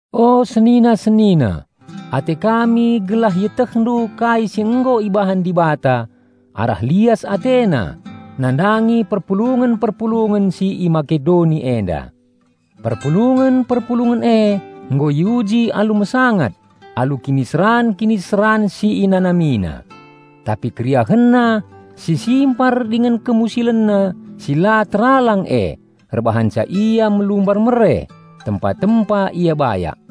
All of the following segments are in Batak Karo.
O senina-senina, ate kami gelah ietehndu kai si nggo ibahan Dibata arah lias AteNa nandangi perpulungen-perpulungen si i Makedoni enda. Perpulungen-perpulungen e nggo iuji alu mesangat alu kiniseran-kiniseran si inanamina. Tapi keriahenna si simpar dingen kemusilenna si la teralang e erbahanca ia melumbar mere, tempa-tempa ia bayak.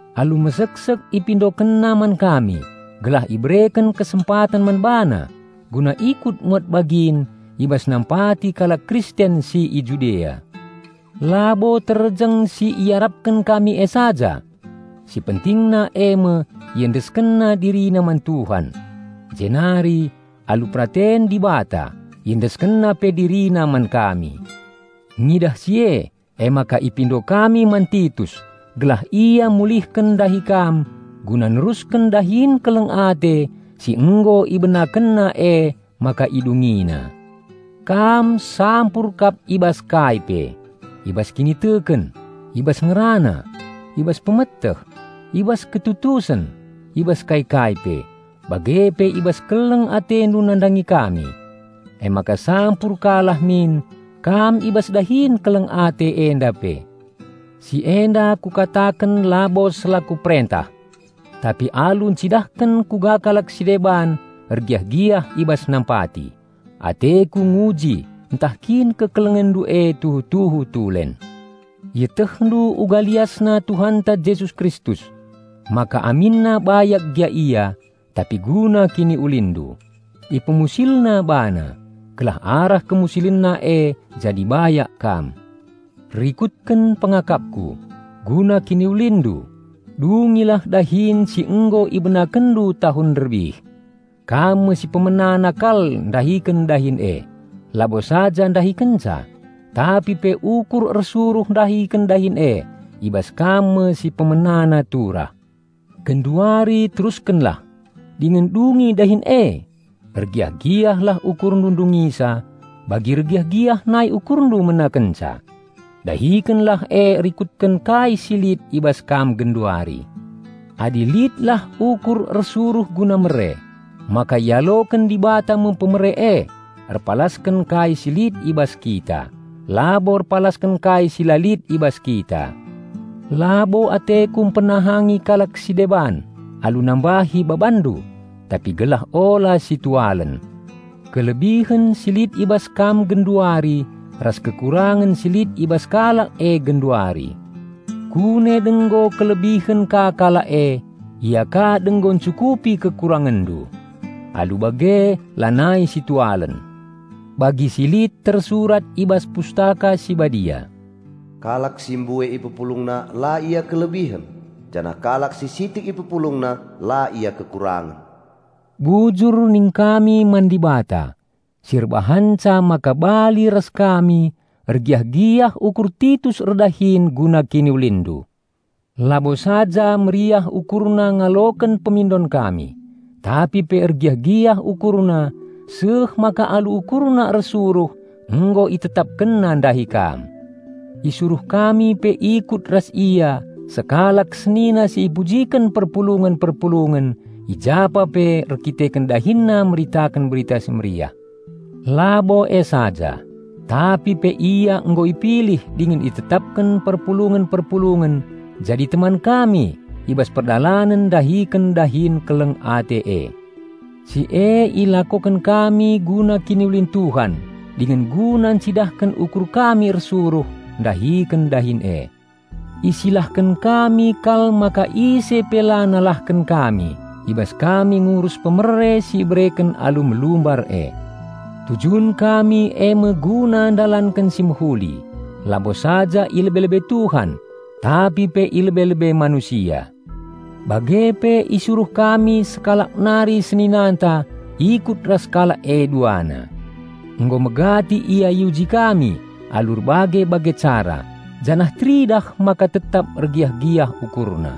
Alu meseksek ipindokenna man kami gelah ibereken kesempaten man bana guna ikut muat bagin i bas nampati kalak Kristen si i Judea. Labo terjeng si iarapken kami e saja! Si pentingna eme iendeskenna dirina man Tuhan. Jenari, alu peraten Dibata, iendeskenna pe dirina man kami. Ngidah si e, emaka ipindo kami man Titus gelah ia mulihken ndahi kam guna nerusken dahin keleng ate si nggo ibenakenna emaka idungina. Kam sampur kap i bas kai pe: i bas kiniteken, i bas ngerana, i bas pemeteh, i bas ketutusen i bas kai-kai pe, bage pe i bas keleng atendu nandangi kami. Emaka sampur ka lah min kam i bas dahin keleng ate enda pe. Si enda kukataken labo selaku perentah. Tapi alu encidahken kuga kalak si deban ergiah-giah i bas nampati, ateku nguji ntah kin kekelengenndu e tuhu-tuhu tulen. Ietehndu uga liasna Tuhanta Jesus Kristus: maka aminna bayak gia Ia, tapi guna kiniulinndu, IpemusilNa BaNa, gelah arah KemusilenNa e jadi bayak kam. Rikutken pengakapku: guna kiniulinndu, dungilah dahin si nggo ibenakenndu tahun nderbih. Kam me si pemenana kal ndahiken dahin e, labo saja ndahikenca, tapi pe ukur ersuruh ndahiken dahin e i bas kam me si pemenana turah. Genduari teruskenlah, dingen dungi dahin e! Ergiah-giahlah ukurndu ndungisa, bagi ergiah-giah nai ukurndu menakenca. Dahikenlah e rikutken kai si lit i bas kam genduari. Adi litlah ukur ersuruh guna mere, maka ialoken Dibata me pemere e erpalasken kai si lit i bas kita, labo erpalasken kai si la lit i bas kita. Labo ateku mpenahangi kalak si deban alu nambahi babanndu; tapi gelah ula si tualen kelebihen si lit i bas kam genduari ras kekurangen si lit i bas kalak e genduari. Kune denggo kelebihen ka kalak e, ia ka denggo encukupi kekurangenndu. Alu bage lanai situalen. Bagi si lit tersurat i bas Pustaka Si Badia, "Kalak si mbue ipepulungna la ia kelebihen, janah kalak si sitik ipepulungna la ia kekurangen." Bujur ningkami man Dibata si erbahanca maka bali ras kami ergiah-giah ukur Titus erdahin guna kiniulinndu. Labo saja meriah ukurna ngaloken pemindon kami, tapi pe ergiah-giah ukurna seh maka alu ukurna ersuruh nggo itetapkenna ndahi kam. Isuruh kami pe ikut ras ia sekalak senina si ipujiken perpulungen-perpulungen i japa pe erdandanken dahinna meritaken Berita Si Mehuli. Labo e saja, tapi pe ia nggo ipilih dingen itetapken perpulungen-perpulungen jadi teman kami i bas perdalanen ndahiken dahin keleng ate e. Si e ilakoken kami guna kiniulin Tuhan dingen guna encidahken ukur kami ersuruh ndahiken dahin e. Isilahken kami kal maka ise pe la nalahken kami i bas kami ngurus pemere si ibereken alu melumbar e. Tujun kami eme guna ndalanken si mehuli, labo saja i lebe-lebe Tuhan, tapi pe i lebe-lebe manusia. Bage pe isuruh kami sekalak nari seninanta ikut ras kalak e duana. Nggo megati ia iuji kami alu erbage-bage cara, janah teridah maka tetap ergiah-giah ukurna.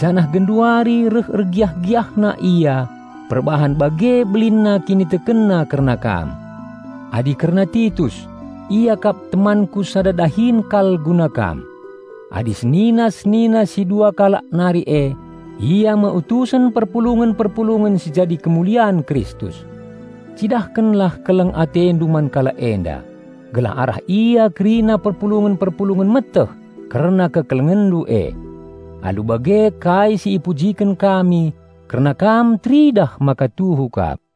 Janah genduari reh ergiah-giahna ia perbahan bage belinna kinitekenna kerna kam. Adi kerna Titus, ia kap temanku sada dahin kal guna kam. Adi senina-senina si dua kalak nari e, ia me utusen perpulungen-perpulungen si jadi kemulian Kristus. Cidahkenlah keleng atendu man kalak enda, gelah arah ia kerina perpulungen-perpulungen meteh kerna kekelengenndu e. Alu bage kai si ipujiken kami kerna kam teridah maka tuhu kap.